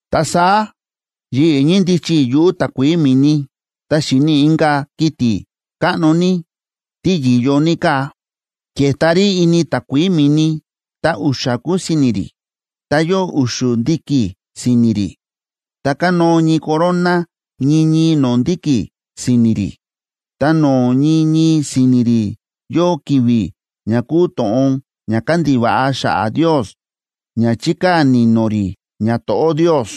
Ta saá yi̱ꞌi̱ ñíndichi i̱ yuꞌu̱ takuií mi̱ni, ta xi̱ni i̱ inka̱ kiti̱ káꞌno tí yi̱yo ní káa, ke̱ta rí ini takuií mi̱ni, ta u̱xa̱ kúu si̱ni̱ rí, ta yóo u̱xu̱ ndi̱ki̱ si̱ni̱ rí, ta kánóo ñii corona ñii ñii no̱o̱ ndi̱ki̱ si̱ni̱ rí. Ta no̱o̱ ñii ñii si̱ni̱ rí yóo ki̱vi̱ ña kúu to̱ꞌon ña kándiva̱ꞌa xa̱ꞌa̱ Ndios ña chíkaa̱ ni̱no̱ rí ñato̱ꞌó Ndios.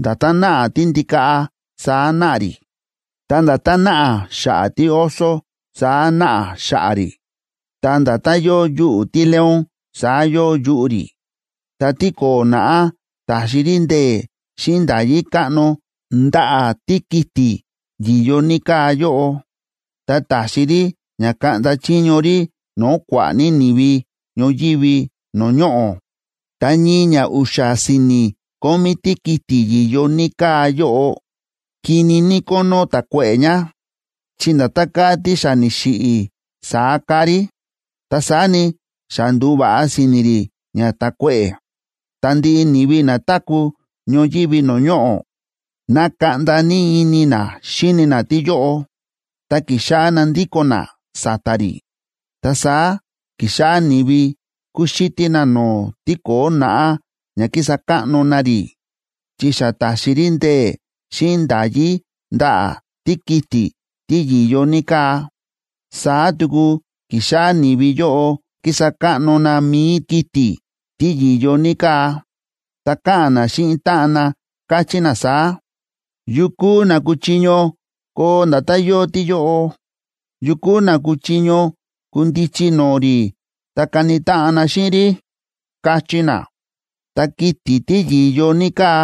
Nda̱tán náꞌa tíndikaꞌa saá náꞌa rí. Ta nda̱tán náꞌa xa̱ꞌa̱ tíoso, saá náꞌa xa̱ꞌa̱ rí. Ta nda̱tán yóo yuꞌu̱ tíleón saá yóo yuꞌu̱ rí. Ta tíko̱o̱ naꞌá ta̱xi rí ndee̱ xíꞌin nda̱yí káꞌno ndaꞌa̱ tíkiti̱ yi̱yo ní káa yóꞌo, ta ta̱xi rí ña kaꞌnda chiño rí no̱o̱ kua̱ꞌa̱ ní ni̱vi ñoyívi no̱o̱ ñoꞌo̱. Ta ñii ña u̱xa̱ si̱ni̱ kómí tíkiti̱ yi̱yo ní káa yóꞌo, kini ní kónó ta̱kuéꞌe̱ ña, chi nda̱tán káa tí xa ni̱xiꞌi̱, saá káa rí. Ta saá ni, xa ndu̱va̱ꞌa si̱ni̱ rí ña ta̱kuéꞌe̱, ta ndiꞌi ni̱vi na táku̱ ñoyívi no̱o̱ ñoꞌo̱, na̱kaꞌnda ní ini na xíni na tíyóꞌo, ta ki̱xáꞌá na ndíko̱n na sa̱ta̱ rí. Ta saá ki̱xáꞌá ni̱vi kúxítí na no̱o̱ tíko̱o̱ naꞌá ña kísa káꞌno na rí, chi xa ta̱xi rí ndee̱ xíꞌin nda̱yí ndaꞌa̱ tíkiti̱ tí yi̱yo ní káa. Saá tuku ki̱xáꞌá ni̱vi yóꞌo kísa káꞌno na mi̱i kiti̱ tí yi̱yo ní káa, ta káꞌa̱n na xíꞌin táꞌan na, káchí na saá: ―¿Yu kúu na kuchiño koo nda̱tán yóo tíyóꞌo? ¿Yu kúu na kuchiño kundichi no̱o̱ rí ta kani táꞌan na xíꞌin rí? ―káchí na. Ta kiti̱ tí yi̱yo ní káa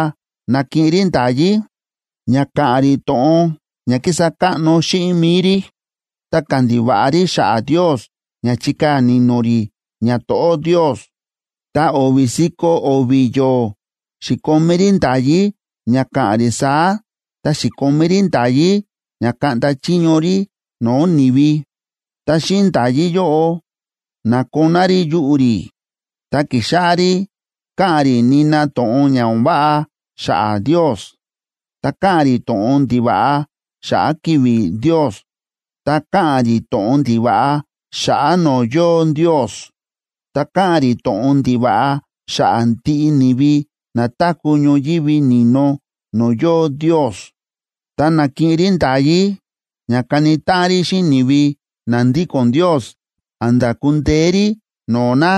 na̱kiꞌin rí nda̱yí ña ka̱ꞌa̱n rí to̱ꞌon ña kísa káꞌno xíꞌin mi̱i rí, ta kandiva̱ꞌa rí xa̱ꞌa̱ Ndios ña chikaa̱ ni̱no̱ rí ñato̱ꞌó Ndios. Ta o̱vi̱ si̱ko̱ o̱vi̱ yo̱o̱ xi̱komí rí nda̱yí ña ka̱ꞌa̱n rí saá ta xi̱komí rí nda̱yí ña kaꞌnda chiño rí no̱o̱ ni̱vi. Ta xíꞌin nda̱yí yóꞌo, na̱koná rí yuꞌu̱ rí, ta ki̱xáꞌá rí káꞌa̱n rí nina to̱ꞌon ña o̱n váꞌa xa̱ꞌa̱ Ndios, ta káꞌa̱n rí to̱ꞌon ndiva̱ꞌa xa̱ꞌa̱ ki̱vi̱ Ndios, ta káꞌa̱n rí to̱ꞌon ndiva̱ꞌa xa̱ꞌa̱ no̱o̱ yóo Ndios, ta káꞌa̱n rí to̱ꞌon ndiva̱ꞌa xa̱ꞌa̱ ndiꞌi ni̱vi na táku̱ ñoyívi ni̱no no̱o̱ yóo Ndios. Ta na̱kiꞌin rí nda̱yí ña kani táꞌan rí xíꞌin ni̱vi na ndíko̱n Ndios a̱nda̱ ku̱ndeé rí no̱o̱ na.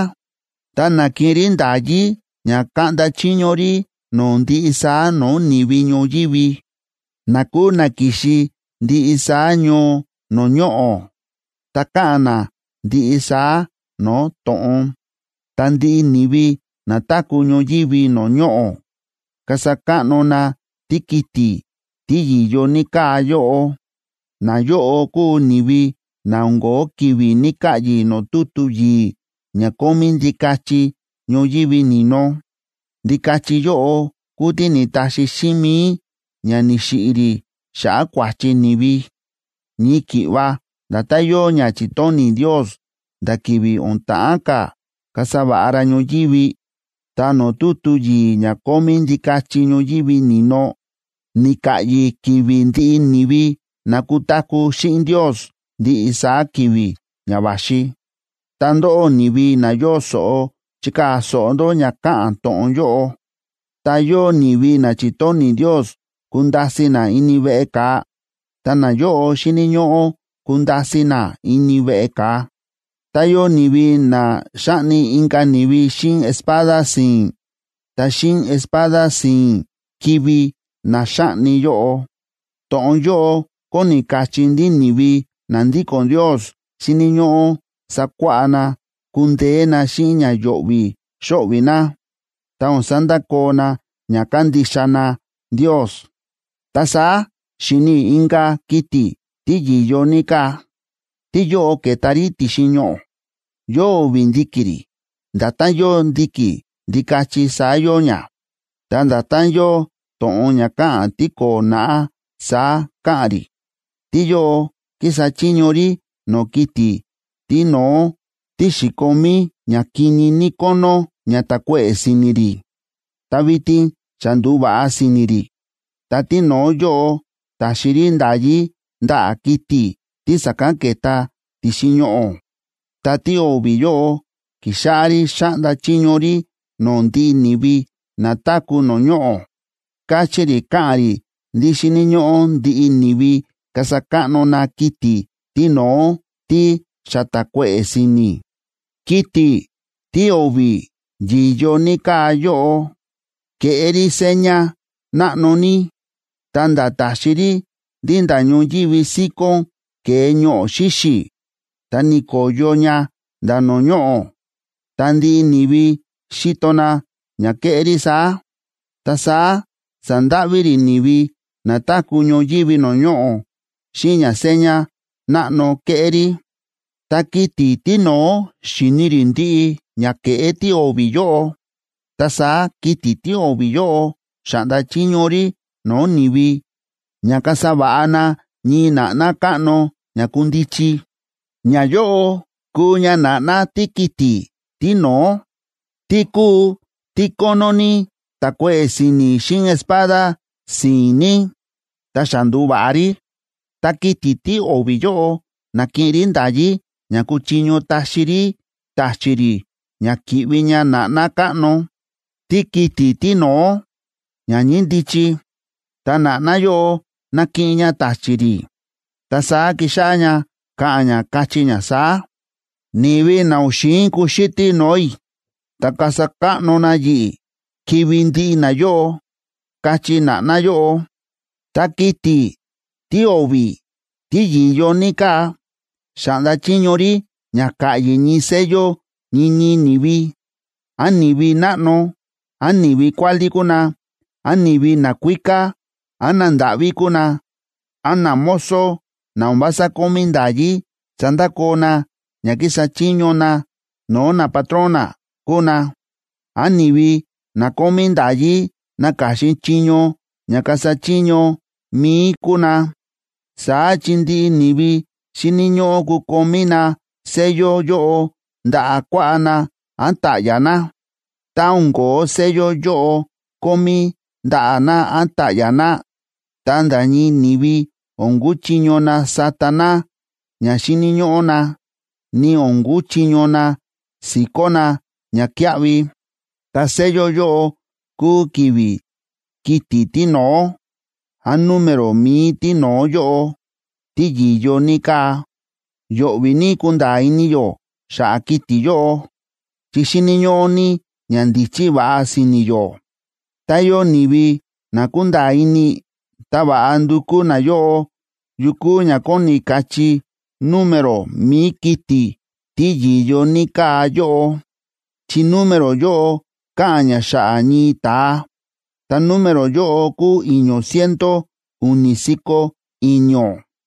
Ta na̱kiꞌin rí nda̱yí ña kaꞌnda chiño rí no̱o̱ ndiꞌi saá no̱o̱ ni̱vi ñoyívi, na kúu na ki̱xi ndiꞌi saá ñoo no̱o̱ ñoꞌo̱, ta káꞌa̱n na ndiꞌi saá no̱o̱ to̱ꞌon. Ta ndiꞌi ni̱vi na táku̱ ñoyívi no̱o̱ ñoꞌo̱ kasa káꞌno na tíkiti̱ tí yi̱yo ní káa yóꞌo. Nayóꞌo kúu ni̱vi na o̱n ko̱ó ki̱vi̱ ni̱ka̱ꞌyi̱ no̱o̱ tutu yi̱i̱ ña kómí Ndikachi ñoyívi ni̱no. Ndikachi yóꞌo kúu tí ni̱taxi xíꞌin mi̱i ña ni̱xiꞌi̱ rí xa̱ꞌa̱ kua̱chi ni̱vi, ñii ki̱ꞌva nda̱tán yóo ña chi̱tóni̱ Ndios nda̱ ki̱vi̱ o̱n ta̱ꞌán ka̱ kasa va̱ꞌa ra ñoyívi. Ta no̱o̱ tutu yi̱i̱ ña kómí Ndikachi ñoyívi ni̱no, ni̱ka̱ꞌyi̱ ki̱vi̱ ndiꞌi ni̱vi na kutaku̱ xíꞌin Ndios ndiꞌi saá ki̱vi̱ ña va̱xi. Ta ndóꞌó, ni̱vi na yóo so̱ꞌo, chikaa̱ so̱ꞌo ndó ña káꞌa̱n to̱ꞌon yóꞌo. Tá yóo ni̱vi na chi̱tóni̱ Ndios kunda̱si̱ na ini veꞌe ka̱a, ta nayóꞌo xíni̱ ñóꞌó kunda̱si̱ na ini veꞌe ka̱a. Tá yóo ni̱vi na xa̱ꞌni inka̱ ni̱vi xíꞌin espada si̱i̱n, ta xíꞌin espada si̱i̱n kivi̱ na xáꞌni yóꞌo. To̱ꞌon yóꞌo kóni kachí ndí ni̱vi na ndíko̱n Ndios xíni̱ ñóꞌó sakuáꞌá na kundeé na xíꞌin ña yo̱ꞌvi̱ xo̱ꞌvi̱ na, ta o̱n sandakoo na ña kándixa na Ndios. Ta saá xi̱ni i̱ inka̱ kiti̱ tí yi̱yo ní káa, tíyóꞌo ke̱ta rí ti̱xin ñoꞌo̱. Yóo o̱vi̱ ndi̱ki̱ rí, nda̱tán yóo ndi̱ki̱ ndikachi saá yóo ña, ta nda̱tán yóo to̱ꞌon ña káꞌa̱n tíko̱o̱ naꞌá, saá káꞌa̱n rí. Tíyóꞌo kísa chiño rí no̱o̱ kiti̱ tíno̱ó tí xi̱komí ña kini ní kónó ña ta̱kuéꞌe̱ si̱ni̱ rí, ta vitin xa ndu̱va̱ꞌa si̱ni̱ rí. Ta tíno̱ó yóꞌo ta̱xi rí nda̱yí ndaꞌa̱ kiti̱ tí sa̱kán ke̱ta ti̱xin ñoꞌo̱, ta tío̱vi̱ yóꞌo ki̱xáꞌá rí xáꞌnda chiño rí no̱o̱ ndiꞌi ni̱vi na táku̱ no̱o̱ ñoꞌo̱. Káchí rí káꞌa̱n rí ndí xíni̱ ñóꞌó ndiꞌi ni̱vi kasa káꞌno na kiti̱ tíno̱ó tí xa ta̱kuéꞌe̱ si̱ni̱. Kiti̱ tío̱vi̱ yi̱yo ní káa yóꞌo, ke̱ꞌé rí seña náꞌno ní, ta̱nda̱ ta̱xi rí ndí nda̱ ñoyívi síkón ke̱e ñoꞌo̱ xíxi̱, ta ni̱ko̱yo ña nda̱ no̱o̱ ñoꞌo̱. Ta ndiꞌi ni̱vi xi̱to na ña ke̱ꞌé rí saá. Ta saá sa̱ndáꞌví rí ni̱vi na táku̱ ñoyívi no̱o̱ ñoꞌo̱ xíꞌin ña seña náꞌno ke̱ꞌé rí. Ta kiti̱ tíno̱ó xi̱ni rí ndiꞌi ña ke̱ꞌé tío̱vi̱ yóꞌo. Ta saá kiti̱ tío̱vi̱ yóꞌo xa̱ꞌnda chiño rí no̱o̱ ni̱vi ña kasa va̱ꞌa na ñii na̱ꞌná káꞌno ña kundichi. Ñayóꞌo kúu ña na̱ꞌná tíkiti̱ tíno̱ó, tí kúu tí kónó ní ta̱kuéꞌe̱ si̱ni̱ xíꞌin espada si̱i̱n ní, ta xa ndu̱va̱ꞌa rí. Ta kiti̱ tío̱vi̱ yóꞌo na̱kiꞌin rí nda̱yí ña ku̱chiño taxi rí ta̱chi̱ rí ña ki̱ꞌvi ña na̱ꞌná káꞌno tíkiti̱ tíno̱ó, ña ñíndichi. Ta na̱ꞌná yóꞌo na̱kiꞌin ña ta̱chi̱ rí, ta saá ki̱xáꞌá ña káꞌa̱n ña, káchí ña saá: ―Ni̱vi na o̱n xi̱in kuxítí no̱o̱ i̱ ta kasa káꞌno na yi̱ꞌi̱, kivi̱ ndiꞌi nayóꞌo ―káchí na̱ꞌná yóꞌo. Ta kiti̱ tío̱vi̱ tí yi̱yo ní káa, xa̱ꞌnda chiño rí ña ka̱ꞌyi̱ ñii sello ñii ñii ni̱vi, án ni̱vi náꞌno, án ni̱vi kuálí kúu na, án ni̱vi nakuíká án nandáꞌví kúu na, án namozo na o̱n vása kómí nda̱yí sandakoo na ña kísa chiño na no̱o̱ napatrón na kúu na, án ni̱vi na kómí nda̱yí naka̱xin chiño ña kasa chiño mi̱i kúu na. Saá chi ndiꞌi ni̱vi xíni̱ ñóꞌó kukomí na sello yóꞌo ndaꞌa̱ kuaꞌá na án ta̱ꞌya̱ na. Tá o̱n ko̱ó sello yóꞌo kómí ndaꞌa̱ na án ta̱ꞌya̱ na, ta nda̱ ñii ni̱vi o̱n kuchiño na sata na ña xíni̱ ñóꞌó na, ni o̱n kuchiño na si̱kó na ñakíaꞌvi. Ta sello yóꞌo kúu ki̱vi̱ kiti̱ tíno̱ó, án número mi̱i tíno̱ó yóꞌo, tí yi̱yo ní káa. Yo̱ꞌvi̱ ní kunda̱a̱ ini yó xa̱ꞌa̱ kiti̱ yóꞌo, chi xíni̱ ñóꞌó ní ñandíchí va̱ꞌa si̱ni̱ yó. Tá yóo ni̱vi na kúnda̱a̱ ini, ta va̱ꞌa ndukú nayóꞌo yu kúu ña kóni kachí número mi̱i kiti̱ tí yi̱yo ní káa yóꞌo, chi número yóꞌo káꞌa̱n ña xa̱ꞌa̱ ñii ta̱a, ta número yóꞌo kúu i̱ño̱ ciento u̱ni̱ si̱ko̱ i̱ño̱.